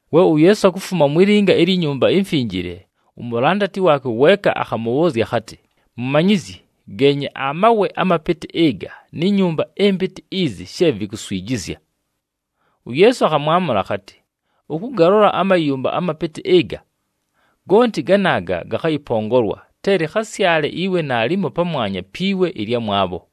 We uYeesu akufuma mwi linga ilyi Nyumba iMfinjile, umulandati waakwe weeka akhamʉbhʉʉzya akhatɨ, “Mumanyizyi, geenye amawe amapɨtɨ ɨga ni nyumba ɨmpɨtɨ izi she vikuswijizya!” UYeesu akhamwamʉla akhatɨ, “Ʉkʉgalola amayumba amapɨtɨ ɨga? Gonti ganaaga gakhayɨpongolwa, te lɨkhasyale iwe naalimo pamwanya pi we ɨlyamwabho!”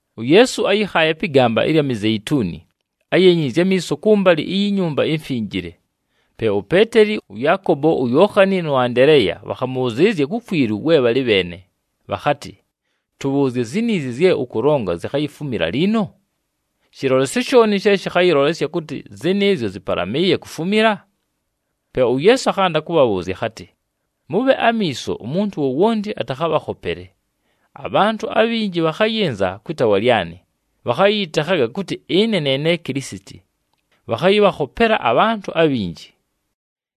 UYeesu áyɨkhaaye pɨ gamba ɨlya Mizeituni, áyenyiizye amiiso kʉmbalɨ iyi Nyumba iMfinjile. Pe uPeeteli, ʉYaakobo, uYookhani nʉ Andeleeya bhakhamʉbhʉzɨɨlɨzya kukwilu we bhalɨ bheene, bhakhatɨ, “Tʉbhʉʉzye, ziniizi zye ʉkʉlonga zikhayifumila liino? Shɨlolesyo shooni she shɨkhayɨlolesya kʉtɨ zɨnɨɨzyo zɨpalamɨɨye kufumila?” Pe uYeesu akhanda kʉbhabhʉʉzya, akhatɨ, “Mʉbhe amiiso, umuntu wowonti atakhabhakhopele! Abhantʉ abhinji bhakhayɨnza kwɨ taawa lyanɨ, bhakhayɨyɨtekhaga kʉtɨ, ‘Ɨne ne ne Kilisiti,’ bhakhayɨbhakhopela abhantʉ abhinji.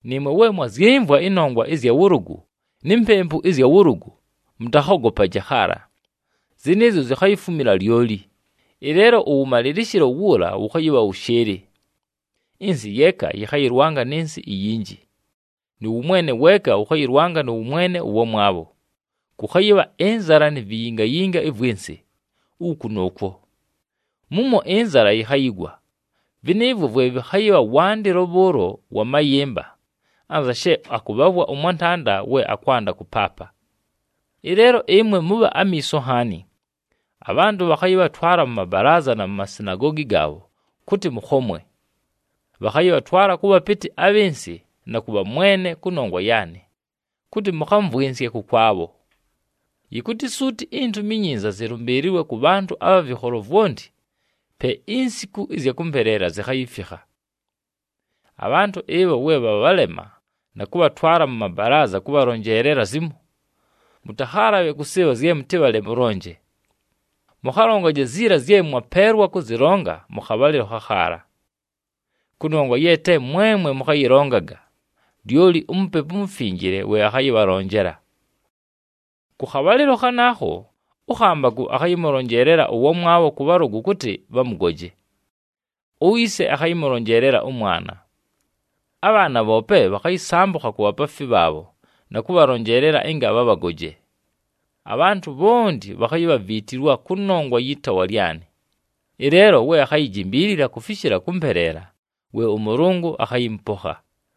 Nɨɨmwe we mwazyɨmvwa ɨnongwa ɨzya wʉlʉgʉ, ni mpempu ɨzya wʉlʉgʉ, mʉtakhogopaje khaala. Zɨnɨɨzyo zikhayifumila lyoli, ɨleelo ʉwʉmalɨlɨshɨlo wuula wʉkhayɨbha wʉshɨɨlɨ. Ɨnsɨ yeeka yɨkhayɨlwanga nɨ nsɨ iyinji, nʉ wʉmwene weeka wʉkhayɨlwanga nʉ wʉmwene ʉwamwabho. Kʉkhayɨbha ɨnzala ni viyingayinga ɨvwɨ nsɨ, uku nʉʉkwo. Mumo ɨnzala yikhayigwa. Vɨnɨɨvwo vwe vɨkhayɨbha wandɨlo bhʉʉlo wa mayɨmba, anza she akʉbhabhwa ʉmwantanda we akwanda kʉpaapa. “Ɨleelo ɨmwe mʉbhe amiiso nhaani, abhantʉ bhakhayɨbhatwala mʉ mabalaaza na mu masinagoogi gaabho kʉtɨ mʉkhomwe. Bhakhayɨbhatwala kʉ bhapɨtɨ abhɨ nsɨ na kʉ bhamwene kʉnongwa yaanɨ, kʉtɨ mʉkhamvwɨnsye kʉkwabho. Yɨkʉtɨ suuti iNtumi iNyinza zɨlʉmbɨɨlɨlwe kʉ bhantʉ abha vɨkholo vwonti, pe insiku ɨzya kʉmpeleela zikhayifikha. Abhantʉ ɨbho we bhabhalema na kʉbhatwala mʉ mabalaaza, kʉbhalonjeelela zimo, mʉtakhaalabhe kʉsɨɨbha zye mʉtɨbhale mʉlonje. Mʉkhalongaje ziila zye mwapeelwa kʉzɨlonga mʉ khabhalɨlo khakhaala. Kʉnongwa ye te mwemwe mʉkhayɨlongaga, lyoli uMupepu uMufinjile we akhayɨbhalonjela. “Kʉ khabhalɨlo khanaakho, ʉkhambakʉ akhayɨmʉlonjeelela ʉwamwabho kʉ bhalʉgʉ kʉtɨ bhamʉgoje, uyise akhayɨmʉlonjeelela ʉmwana. Abhaana bhoope bhakhayɨsambʉkha ku bhapaafi bhaabho na kʉbhalonjeelela ɨnga bhabhagoje. Abhantʉ bhonti bhakhayibhaviitilwa kʉnongwa yɨ taawa lyanɨ. Ɨleelo, we akhayijimbiilila kufishila kʉmpeleela we ʉMʉlʉngʉ akhayɨmʉpokha.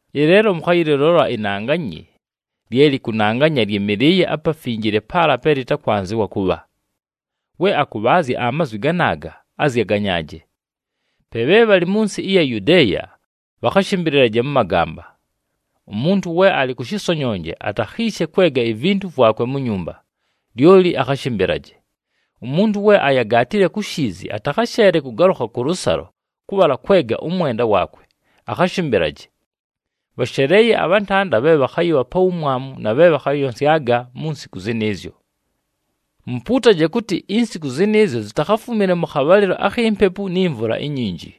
“Ɨleelo mʉkhayɨlɨlola ‘inanganyi lye lɨkʉnanganya’ lyɨmɨlɨɨye aPafinjile paala pe lɨtakwanzɨwa kʉbha. We akʉbhaazya amazwi ganaaga, azyaganyaaje, pe bhe bhalɨ mʉ nsɨ ɨya Yudeeya, bhakhashɨmbɨlɨlaje mʉ magamba! Umuntu we alɨ kʉ shɨsonyonje, atakhiishe kwega ivintu vwakwe mu nyumba, lyoli akhashɨmbɨlaje! Umuntu we ayagaatile ku shiizi atakhasheele kʉgalʉkha kʉlʉsalo kʉbhala kwega ʉmwenda waakwe, akhashɨmbɨlaje! Bhasheleeye abhantanda bhe bhakhayɨbha pa wumwamu na bhe bhakhayonsyaga mu nsiku zɨnɨɨzyo! Mupuutaje kʉtɨ insiku zɨnɨɨzyo zitakhafumile mʉ khabhalɨlo akhi mpepu ni mvula inyinji.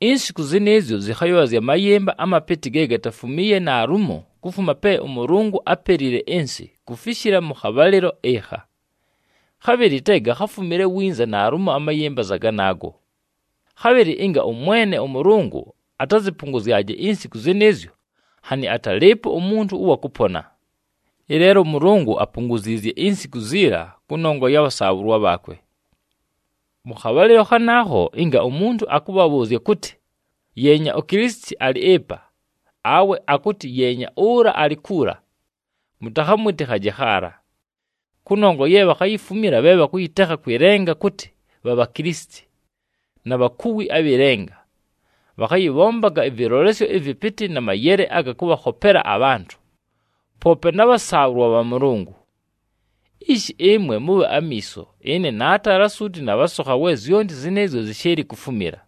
Insiku zɨnɨɨzyo zɨkhayɨbha zya mayɨmba amapɨtɨ ge gatafumiiye naalumo kufuma pe ʉMʉlʉngʉ ápelile ɨnsɨ kufishila mʉ khabhalɨlo ɨkha. Khabhɨlɨ te gakhafumile winza naalumo amayɨmba anza ganaago. Khabhɨlɨ ɨnga ʉMwene ʉMʉlʉngʉ atazɨpʉngʉzyaje insiku zɨnɨɨzyo, nhanɨ atalɨɨpo umuntu ʉwa kʉpona. Ɨleelo ʉMʉlʉngʉ apunguziizye insiku ziila, kʉnongwa ya bhasaabhʉlwa bhaakwe. “Mʉ khabhalɨlo khanaakho, ɨnga umuntu akʉbhabhʉʉzya kʉtɨ, ‘Yeenya, uKilisiti alɨ ɨpa!’ Awe akʉtɨ, ‘Yeenya, ʉla alɨ kuula!’ Mʉtakhamwɨtɨkhaje khaala. Kʉnongwa ye bhakhayifumila bhe bhakʉyɨtekha kwɨ lenga kʉtɨ bhabha Kilisiti, na bhakuwi abhɨ lenga. Bhakhayɨbhombaga ɨvɨlolesyo ɨvɨpɨtɨ na mayele aga kʉbhakhopela abhantʉ, poope na bhasaabhʉlwa bha Mʉlʉngʉ. Ishi ɨmwe, mʉbhe amiiso! Ɨne naatala suuti nabhasokha we zyonti zɨnɨɨzyo zɨshɨɨlɨ kufumila.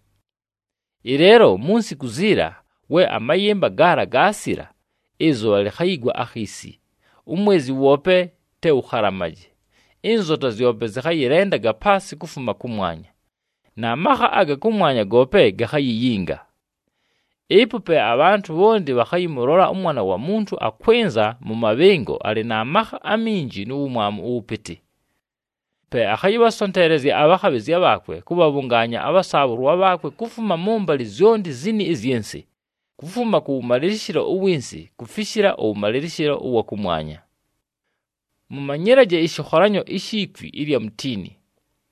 “Ɨleelo mu nsiku ziila, we amayɨmba gaala gaasila, ‘Ɨzʉbha likhayigwa akhiisi, umwezi woope te wʉkhalamaje, ɨnzota zyope zɨkhayɨlendaga paasɨ kufuma kʉmwanya, na makha aga kʉmwanya goope gakhayiyinga.’ “Ɨpo pe abhantʉ bhonti bhakhayɨmʉlola ʉMwana wa Muntu akwɨnza mʉ mabhɨngo alɨ na makha aminji nu wumwamu ʉwʉpɨtɨ. Pe akhayɨbhasonteelezya abhakhabhɨzya bhaakwe kʉbhabhʉngaanya abhasaabhʉlwa bhaakwe kufuma mʉmbalɨ zyonti zini ɨzyɨ nsɨ, kufuma kʉwʉmalɨlɨshɨlo ʉwɨ nsɨ kufishila ʉwʉmalɨlɨshɨlo ʉwa kʉmwanya. “Mʉmanyɨlaje ɨshɨkholanyo ishi kwi ɨlya mutiini.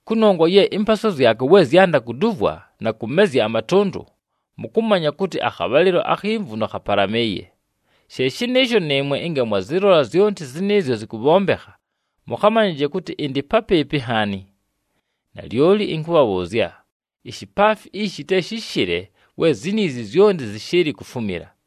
Kʉnongwa ye ɨmpaaswa zyakwe we zyanda kuduvwa na kʉmezya amatʉndʉ, mʉkʉmanya kʉtɨ akhabhalɨlo akhi mvuno khapalamɨɨye. She shɨnɨɨsho, nɨɨmwe ɨnga mwazɨlola zyonti zɨnɨɨzyo zɨkʉbhombekha, mʉkhamanyaje kʉtɨ ɨndɨ papɨɨpɨ nhaani. Nalyoli ɨnkʉbhabhʉʉzya, ishipaafi ishi te shɨshɨle we ziniizi zyonti zɨshɨɨlɨ kufumila.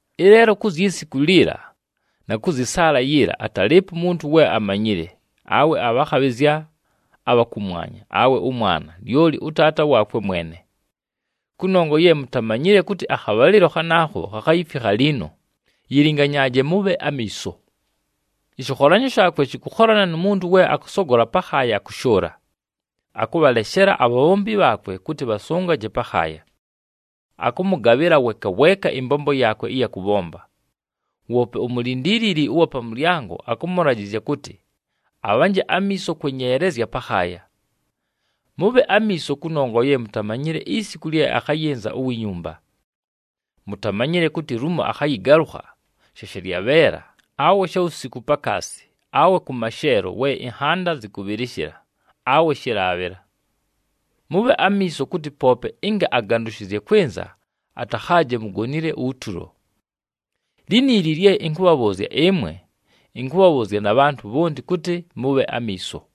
“Ɨleelo ku zyi siku liila na kʉ zyɨ saala yiila, atalɨɨpo umuntu we amanyile awe abhakhabhɨzya abha kʉmwanya, awe ʉMwana, lyoli ʉTaata waakwe mwene. Kʉnongwa ye mutamanyile kʉtɨ akhabhalɨlo khanaakho khakhayifikha liino, yɨlɨnganyaaje, mʉbhe amiiso! “Ɨshɨkholanyo shaakwe shɨkʉkholana nu muntu we akʉsogola pakhaaya, akʉshʉʉla. Akʉbhaleshela abhabhombi bhaakwe kʉtɨ bhasʉngaje pakhaaya. Akʉmʉgabhɨla weeka weeka ɨmbombo yaakwe ɨya kʉbhomba. Woope umulindiilili ʉwa pa mʉlyango akʉmʉlajɨzya kʉtɨ, abhanje amiiso kwenyeelezya pakhaaya. Mʉbhe amiiso, kʉnongwa ye mutamanyile isiku lye akhayɨnza uwi nyumba. Mutamanyile kʉtɨ lumo akhayɨgalʉkha sha shalyabheela, awe shawusiku pakaasi awe kʉ masheelo we ɨnhanda zɨkʉbhɨlɨshɨla awe shɨlaabhɨla. Mʉbhe amiiso, kʉtɨ poope ɨnga agandʉshɨzya kwɨnza, atakhaaje mugonile utulo. Liniili lye ɨnkʉbhabhʉʉzya ɨmwe, ɨnkʉbhabhʉʉzya na bhantʉ bhonti kʉtɨ mʉbhe amiiso.”